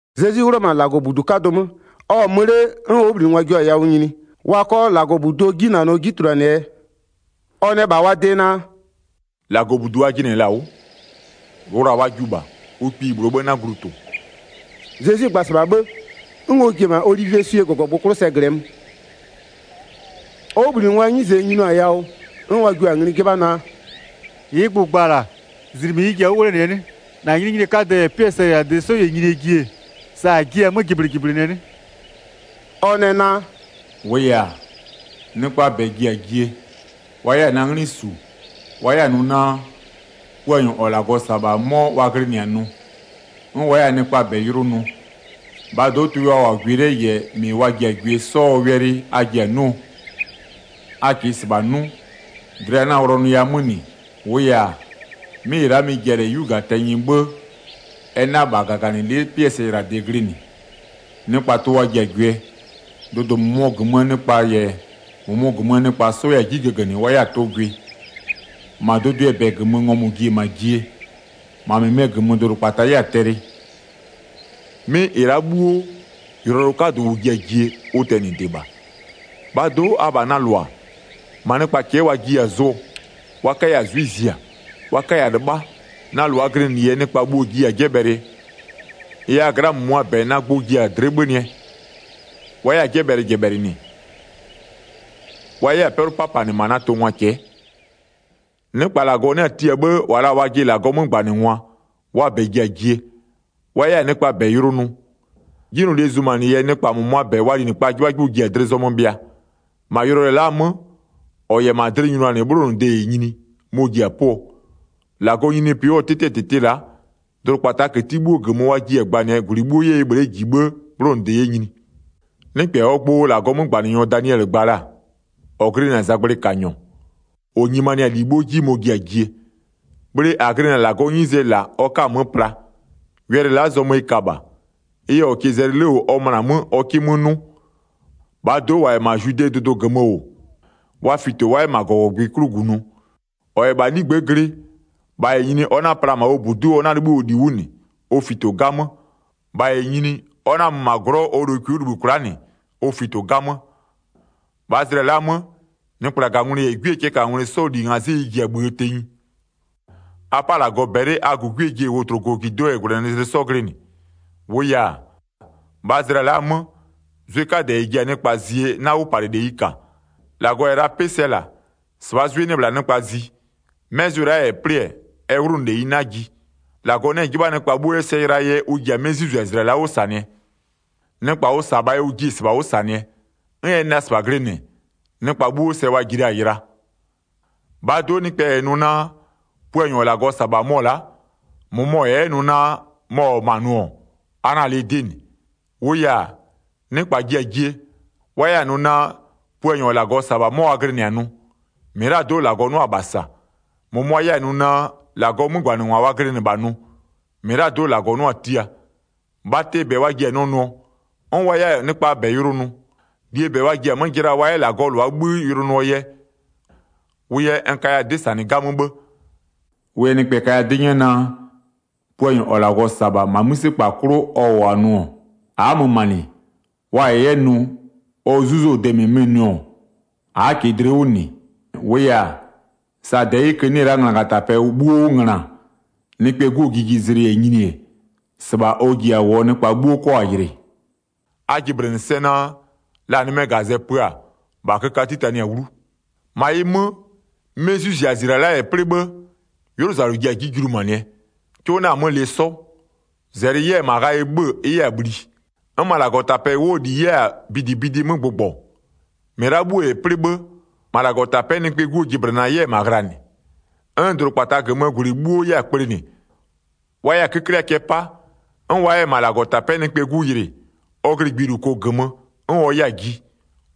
Zezwi 'wlʋ-ɔ -ma -Lagɔbudu 'kadʋ 'mö, ɔ-ɔ mö 'le 'n ɔ 'wʋbhlinɩngwa jio-a yawʋ nyini wa 'kɔ -Lagɔbuduo 'jinanɔ 'ji tuluanɩɛ yɛ. Ɔ nɛ -bha wa de naa: “-Lagɔbudu a jɩnɩ-ɛ -la 'wʋ, wla-a wa jiʋ -bha. Ʋ kpiyi -bhlʋ 'tɩɛ 'bhë 'na glu tʋ-ʋ.” Zezwi gba-a -sɩbha 'bhë, 'n ɔ ji-e -ma Olivieswie -gɔgɔgbʋ 'klʋ sɛ -glɩɛ mö. Ɔ 'wʋbhlinɩngwaa 'nyize nyinio-a yawʋ 'n wa jio-a ngli 'jɩbha naa: “-Ɩɩ gbʋ -n gba-a -la, -zlɩmɩ ɩ ji-a 'wʋ 'wlenɩɛ 'nɩ? -Na nyininyinie 'kadɛ -yɛ 'pɩɛ sɛyɩlade 'sɔ -yɛ nyinie ji-e, sa -a jiɩ-a 'mö jɩblɩjɩblɩnɩɛ 'nɩ?” Ɔ nɛ naa: “A möna 'mö nɩkpa jiya-a yʋlʋ nʋ. 5-Wʋʋ yɛ-a, nɩkpaa -bɛ ji-a jie, wa 'yɛ-a na 'nglɩ -su, wa 'yɛ-a nʋ naa: Puanyɔ -ɔ -Lagɔ -sa-a -bha 'mɔ wa glɩnɩ-a nʋ. 'N wa 'yɛ-a nɩkpaa -bɛ yʋlʋ nʋ. 6-Bhaa do'o tʋɩ wa -wʋ-a gwɩ 'le -yɛ -mɩ wa ji-a gwɩ 'sɔɔ wɛlɩ a ji-a 'nʋɔ. A -kɩɩ -sɩbha 'nʋ, dlɩ 'na-a wlɔnʋya 'mö -nɩ. -Wʋʋ yɛ-a, 'mɩ -ɩ la'a mɩ-ɩ ji-a 'yu -gaa tɛnyɩ 'bhë, ɛ 'na -bha -gaganɩlɩ'ɩ 'pɩɛ sɛyɩlade glɩnɩ. Nɩkpa tʋ wa ji-a gwɩɛ, dʋdʋ -mʋmʋ -gömöö nɩkpa -yɛ -mʋmʋ -gömöö nɩkpa 'sɔ 'yɛ-a 'ji gögönɩ wa 'yɛ-a tʋ gwɩ. -Ma dʋdʋɩɛ -bɛ -gömö ngɔmʋ-ʋ ji-e -ma jie, -ma -mɩmɩɛ -gömö dʋdʋkpata 'yɛ-a tɛlɩ. 'Mɩ -ɩ la'a 'bhuo, yʋlɔyʋlʋ 'kadʋ -ʋ ji-a jie, ʋ tɛnɩde -bha. 9-Bhaa do'o, abha na -lʋa, -ma nɩkpa cɛ'ɛ wa jiya-a zʋɔ, wa 'kaya 'zwɩ zia, wa 'kaya 'lɩbha, na -lʋaa glɩnɩ yɛ nɩkpa bhuo-o jiya-a 'jɛbhɛlɩɛ. Ɩ yɛ a gla'aa -mʋmʋa -bɛ na gbʋ ji-a dlɩ'ɩ 'bhönɩɛ, wa 'yɛ-a 'jɛbhɛlɩjɛbhɛlɩnɩ, wa 'yɛ-a 'pɛlʋ 'papanɩ -ma na tʋngwa cɛ'ɛ. Nɩkpa -Lagɔ 'nɩ-a tia 'bhë -wa la-a wajɩ -Lagɔɔ 'mögbanɩngwa, wa -bɛ ji-a jie, wa 'yɛ-a nɩkpaa -bɛ yʋlʋ nʋ. 'Jinylolie zumanɩ yɛ nɩkpa -mʋmʋaa -bɛ, wa linɩkpaa 'jɩbhajɩbhʋ ji-a dlɩ zɔmö bhɩa. 13-Ma yʋlɔyʋlʋɛ la'aa 'mö, -ɔ -yɛ -ma dlɩ nyʋnanɩ 'bhlonʋde -yɛ nyini, mɔ-ɔ ji-a 'pʋɔ. 14-Lagɔɔ nyininyinipɩ 'wʋɔ 'tɩtɩɛ -tɩtɩ la'a, dʋdʋkpataa këti 'bhuo -gömö wa jiɩ-a gbanɩɛ -gwlɩ 'bhuo 'yɛ ɩ bhle'e -ji 'bhë 'bhlonʋde 'yɛ nyini. Nɩkpɛ -ɔɔ gbʋ -Lagɔɔ 'mögbanɩnyɔ Daniɛlɩ gba la-a, -ɔ glɩnɩ-a zagblɩkanyɔ, -ɔ nyimanɩ-a -li 'bhuo 'ji mɔ-ɔ ji-a jie, bhle -a glɩnɩ-a -Lagɔɔ 'nyizee -la ɔ 'ka-a 'mö pla. Wɛlɩ la'a, zɔmö ɩ ka -bha. Ɩ yɛ -ɔ -kɩɩ zɛlɩ 'le -wʋ ɔ möna 'mö ɔ 'kɩ 'mö 'nʋ. 16-Bhaa do'o -wa -yɛ -ma Zwidee dʋdʋ -gömö -wʋ, wa fito, wa 'yɛ -ma -gɔgɔgbɩ 'klʋ -gunʋ. 17-Ɔ -yɛ -bha 'ligbë'ë glɩ, -bha -yɛ nyini ɔ 'na-a pla -ma ɔ -budu'u ɔ 'na-a 'libhï ɔ -li 'wʋ -nɩ, ɔ fito 'gamö. 18-Ɔ -yɛ 'yɛ -ma 'lagblɛ'ɛ -wʋ, -bha -yɛ nyini, ɔ 'na-a mö -ma glɔ'ɔ ɔ lokwi 'wʋ -libhï kwla'a -nɩ. Ɔ fito 'gamö. 19-Bhaa zlɩa la'a 'mö, nɩkplagangwlɩ -yɛ 'gwiee cɛɛkangwlɩ 'sɔɔ -li ngazɩ'ɩ ɩ ji-a -bhïë tenyi. 20A 'pa -Lagɔ -bɛlɩ a -gugue ji-e wotlokojido'o -yɛ -gwlɛnɩzlɩ 'sɔ glɩnɩ. 21-Wʋʋ yɛ-a, -bhaa zlɩa la'a 'mö, zwɩ 'kadɛ -ɛ ji-a nɩkpa zie 'na 'wʋpalɩleyi -ka. -Lagɔ -yɛ la 'pɩ sɛ -la, -sɩbhaa 'zwɩ 'nɩ-ɛ -bhla nɩkpa zi. 'Mɛ zwɩ la'a -yɛ 'plɩ-ɛ, ɛ 'wlʋnʋleyi 'na ji. 22-Lagɔ 'nɩ-ɛ 'jɩbha nɩkpa 'bhuo 'yɛ sɛ yɩlaa yɛ ʋ ji-a 'mɩ 'zwɩzizlɩa la'a 'wʋ -sanɩɛ. Nɩkpa ʋ -sa-a -bhaa yɛ ʋ jiɩ-e -sɩbha 'wʋ -sanɩɛ, 'n ɛ nɩ la -sɩbha glɩnɩ, nɩkpa 'bhuo sɛ wa ji la-a yɩla. 23-Bhaa do'o nɩkpɛ -yɛ nʋ naa: Puanyɔ -ɔ -Lagɔ -sa-a -bha mɔ-ɔ la'a, -mʋmɔ -yɛ 'yɛ nʋ naa mɔ -wʋ-ɔ ma'a nʋ-ɔ, a 'na-a lɩ 'dɩ -nɩ. 24-Wʋʋ yɛ-a, nɩkpa ji-a jie, wa 'yɛ-a nʋ naa: Puanyɔ -ɔ -Lagɔ -sa-a -bha 'mɔ wa glɩnɩ-a nʋ, -mɩlado'o -Lagɔ 'nʋa-a -bha -sa. -Mʋmʋa 'yɛ-a nʋ naa: -Lagɔɔ 'mögbanɩngwa wa glɩnɩ -bha nʋ, -mɩlado'o -Lagɔ 'nʋa-a tia. Bhatɩɛ -bɛ wa ji-a nɛ nʋɔ, 'n wa 'yɛ-a nɩkpaa -bɛ yʋlʋ nʋ. -Lie -bɛ wa ji-a 'mö jɩla wa 'yɛ -Lagɔɔ -lʋa 'bhï yʋlʋ nʋɔ yɛ. 25Wʋ yɛ n kaya 'dɩ -sanɩ 'gamö 'bhë. 26Ɩ yɛ nɩkpɛ kaya 'dɩ 'nyɛ naa: Puanyɔ -ɔ -Lagɔ -sa-a -bha -ma 'mïse 'klʋ ɔ -wʋ-a nʋ-ɔ, a'a mö -ma -nɩ. Wa -yɛ 'yɛ nʋ, ɔ 'zuzɔ-ɔ de -mɩmɩ nʋ-ɔ, a'a -kɩɩ dlɩ 'wʋ -nɩ. 27-Wʋʋ yɛ-a, sa -dɛyɩkö 'nɩ-ɛ la'a nglagatapɛ 'bhuo 'wʋ ngöna, Nɩkpɛɛ 'Guo jijizlɩ -yɛ nyini-e, -sɩbha ɔ ji-a -wʋɔ nɩkpa 'bhuo 'kɔ-a yɩlɩ. 28A jɩblɩnɩ sɛ naa, la nɩmɛɛ -gazɛ pö-a, -bha köka 'titanɩ-a 'wlu. Zezwi yɛ ɔ nyininyinie 'kadɛɛ gbʋ gba 29-Ma ɩ 'mö, 'mɩ 'zwɩzizlɩa la'a -yɛ 'plɩ 'bhë, 'ylʋzalʋ ji-a 'ji julumanɩɛ, 'cʋ 'na-a 'mö lɩ 'sɔ. -zɛlɩ 'yɛ-a -ma ghayɩ 'bhö-ö, ɩ 'yɛ-a bhli, 'n -ma -Lagɔtapɛ 'wʋɔ -li 'yɛ-a bidibidi 'mö gbʋgbɔ. 30-Mɩ la'a 'bhuo -yɛ 'plɩ 'bhë, -ma -Lagɔtapɛ'ɛ Nɩkpɛɛ 'Guo jɩblɩna 'yɛ-ɛ -ma ghlanɩ, 'n -ma dʋdʋkpata -gömöö -gwlɩ 'bhuo 'yɛ-a kplenɩ, wa 'yɛ-a 'köklɩa cɛ 'pa, 'n wa 'yɛ-a -ma -Lagɔtapɛ'ɛ Nɩkpɛɛ 'Gu yɩlɩ, ɔ glɩ gbiluko -gömö, 'n ɔ 'yɛ-a ji,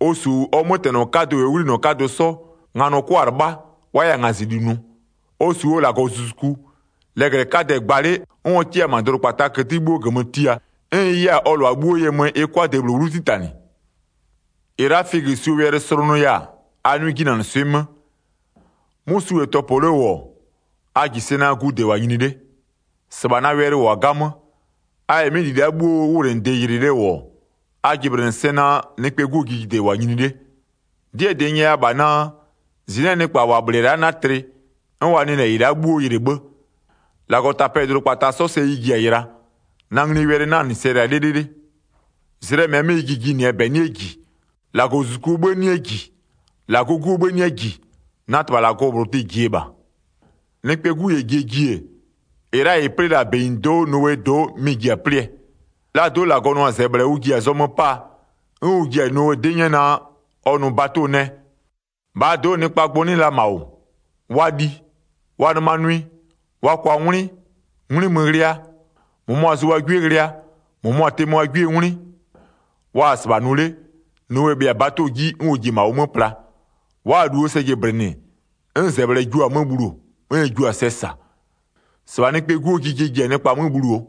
ɔ -su ɔ 'mötɛnɔ 'kadʋ -yɛ ɔ 'ghlinɔ 'kadʋ 'sɔ, nganɔ 'kʋa-a 'lɩbha, wa 'yɛ-a ngazɩli nʋ. 31Ɔ -su ɔ -Lagɔzuzuku, lɛglɛ 'kadɛ-ɛ gba 'le 'n ɔ 'kɩ-a -ma dʋdʋkpataa këti 'bhuo -gömö tia, 'n ɩ 'yɛ-a ɔ -lʋa 'bhuo ye mö ɩ 'kʋa-a de -bhlʋ 'wlu 'titanɩ. Zezwi yɛ figösuo 'ji palɩ 32-Ɩ la'a figösuo wɛlɩ slʋnʋya-a, a 'nʋɩ 'jinanɩswɩ'ɩ 'mö. 'Mʋ su -yɛ tɔpɔ 'le -wʋ-ɔ, a -ji sɛ naa gude -wʋ-a nyini 'le. 33-Sɩbha na wɛlɩ -wʋ-a 'gamö. A -yɛ 'mɩ -li la'a 'bhuoo 'wʋwlenɩde yɩlɩ 'le -wʋ-ɔ, a jɩblɩnɩ sɛ naa, Nɩkpɛɛ 'Guo jijide -wʋ-a nyini 'le. 34'Dɩɛ -dɩ n nyɛya -bha naa: -Zɩnɩ'ɩɛ nɩkpa -wa -bhlɩ-ɛ la'a 'na tlɩ, 'n wa nɩ -lɛ -ɩ la'a 'bhuo yɩlɩ 'bhë. 35-Lagɔtapɛ -yɛ dʋdʋkpata 'sɔ sɛ ɩ ji-a yɩla, na nglie wɛlɩ 'na -nɩ sɛ yɩla 'lɩlɩlɩ. 36Zlɩɛ -mɛɛ 'mö ɩ ji jinɩɛ -bɛ 'nɩɛ -ji, -Lagɔzuzukuo 'bhï 'nɩɛ -ji, -Lagɔɔ 'Guo 'bhë 'nɩɛ -ji, na -Tɩbha -Lagɔ -bhlʋ tɩ-ɩ -jie -bha. A pö a jɩ 'wʋ 37Nɩkpɛɛ 'Gu -yɛ jie ji-e, -ɩ la'a -ɩ 'plɩ la-a -benyido'o Nowee do'o mɩ-ɩ ji-a 'plɩɛ. 38Laa do'o -Lagɔ nʋ-a -zɛbhlɛ ʋ ji-a zɔmö 'paa, 'n ʋ ji-a Nowe 'dɩ 'nyɛ naa: Ɔ nʋ bato nɛ. -Bhaa do'o nɩkpaa gbʋ 'nɩ -ma -wʋ, wa li, wa nɩma nʋɩ, wa kwa 'ngwlɩ, 'ngwlɩ mö ghlɩa, -mʋmʋa zʋ wa 'gwie ghlɩa, -mʋmʋa tɩmö wa 'gwiee 'ngwlɩ. Wa-a -sɩbha nʋ 'le, Nowe bhɩa-a bato 'ji, 'n ɔ ji-e -ma ʋ 'mö pla. 39Wa'a-a -luo sɛ jɩblɩnɩ 'n -zɛbhlɛ jua-a 'mö bhuluo, 'n ɛ jua-a sɛ -sa. -Sɩbha Nɩkpɛɛ 'Guo jijie ji-a nɩkpa 'mö bhuluoo.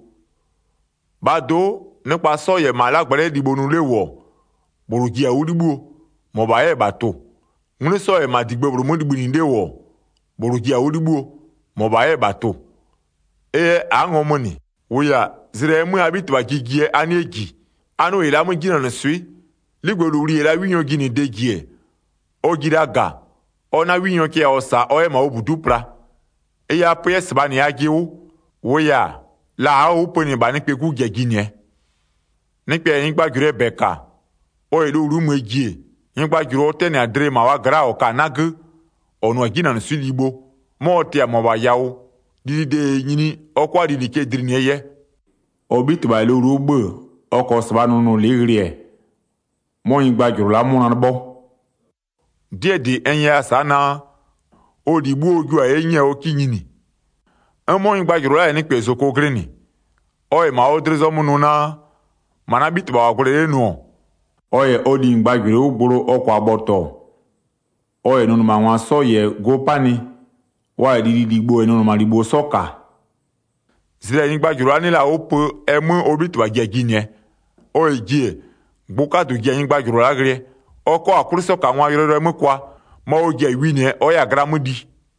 40-Bhaa do'o, nɩkpa 'sɔ -yɛ -ma 'lagblɛ'ɛ libho nʋ 'le -wʋ-ɔ, -bhlʋ ji-a 'wʋ 'libhïo, -mɔbha 'yɛ -bha tʋ-ʋ. 41'Ngwlɩ 'sɔ -yɛ -digbë -bhlʋ 'mö libhïnɩ 'le -wʋ-ɔ, -bhlʋ ji-a 'wʋ 'libhïo, -mɔbha 'yɛ -bha tʋ-ʋ. 42Ɩ yɛ a'a ngɔmö -nɩ, -wʋʋ yɛ-a, zlɩ -ɛɛ 'mö a 'Bhitɩbha ji jie a 'nɩɛ -ji. 43A 'nʋ -ɩ la'a 'mö 'jinanɩswɩ'ɩ, 'ligbëlowli -yɛ la 'winyɔɔ jinɩde -ji-e, ɔ ji la -ga, ɔ 'na 'winyɔ cɛ yawʋ -sa ɔ 'yɛ -ma ɔ -budu'u pla. 44Ɩ yɛ a pö 'yɛ -sɩbha -nɩ ajɩ 'wʋ, -wʋʋ yɛ-a, la a'a-a 'wʋ pönɩ -bha Nɩkpɛɛ 'Gu ji-a jinɩɛ. A nʋ 'jinanɩswɩ'ɩ -Lagɔlibho 45Nɩkpɛ -yɛ nyɩgbajʋlʋɩɛ -bɛ -ka, ɔ -yɛ lowlu'u möö ji-e, nyɩgbajʋlʋ ɔ 'tɛnɩ-ɛ -ma wa gla'a dlɩ -ɔ ka-a 'nagö, -ɔ nʋ-a 'jinanɩswɩ'ɩ libho, 'mɔ ɔ tɩ-a -mʋabha yawʋ, lilide -yɛ nyini, ɔ 'kʋa lili cɛ dlinɩɛ yɛ. 46Ɔ 'bhitɩbha -yɛ lowlu'u 'bhö-ö ɔ -kɔɔ -sɩbhaa nʋnʋlɩ'ɩ ghlɩ-ɛ, 'mɔ nyɩgbajʋlʋ la'a 'mʋna 'lɩbhɔ. 47'Dɩɛ -dɩ n nyɛya-a sa'a naa, ɔ -li 'bhuo ɔ jio-a 'ye 'nyɛɛ ɔ 'kɩ nyini. 48'N 'mɔ nyɩgbajʋlʋ la'a -yɛ nɩkpɛ -zoko glɩnɩ, ɔ -yɛ -ma ɔ dlɩ zɔmö nʋ naa, -ma na 'bhitɩbha -wʋ-a gwlɛ 'le nʋ-ɔ, 49ɔ -yɛ ɔ linyɩgbajʋlʋɩ 'wʋ gblo ɔ -kʋa bhɔtɔ, ɔ -yɛ nʋnɩmangwa 'sɔ -yɛ go 'panɩ, wa -yɛ lililibho -yɛ nʋnɩmalibho 'sɔ -ka, 50zlɩ -ɛ nyɩgbajʋlʋ la'a 'nɩ la-a 'wʋ pö ɛ 'mö ɔ 'bhitɩbha ji-a jinɩɛ. 51Ɔ -yɛ ji-e, gbʋ 'kadʋ ji-a nyɩgbajʋlʋ la'a ghlɩɛ, ɔ 'kɔ-a 'kwlɩsɔkangwaa yʋlɔyʋlʋɛ 'mö kʋa, -ma ɔ ji-a winɩɛ ɔ 'yɛ-a gla 'mö li.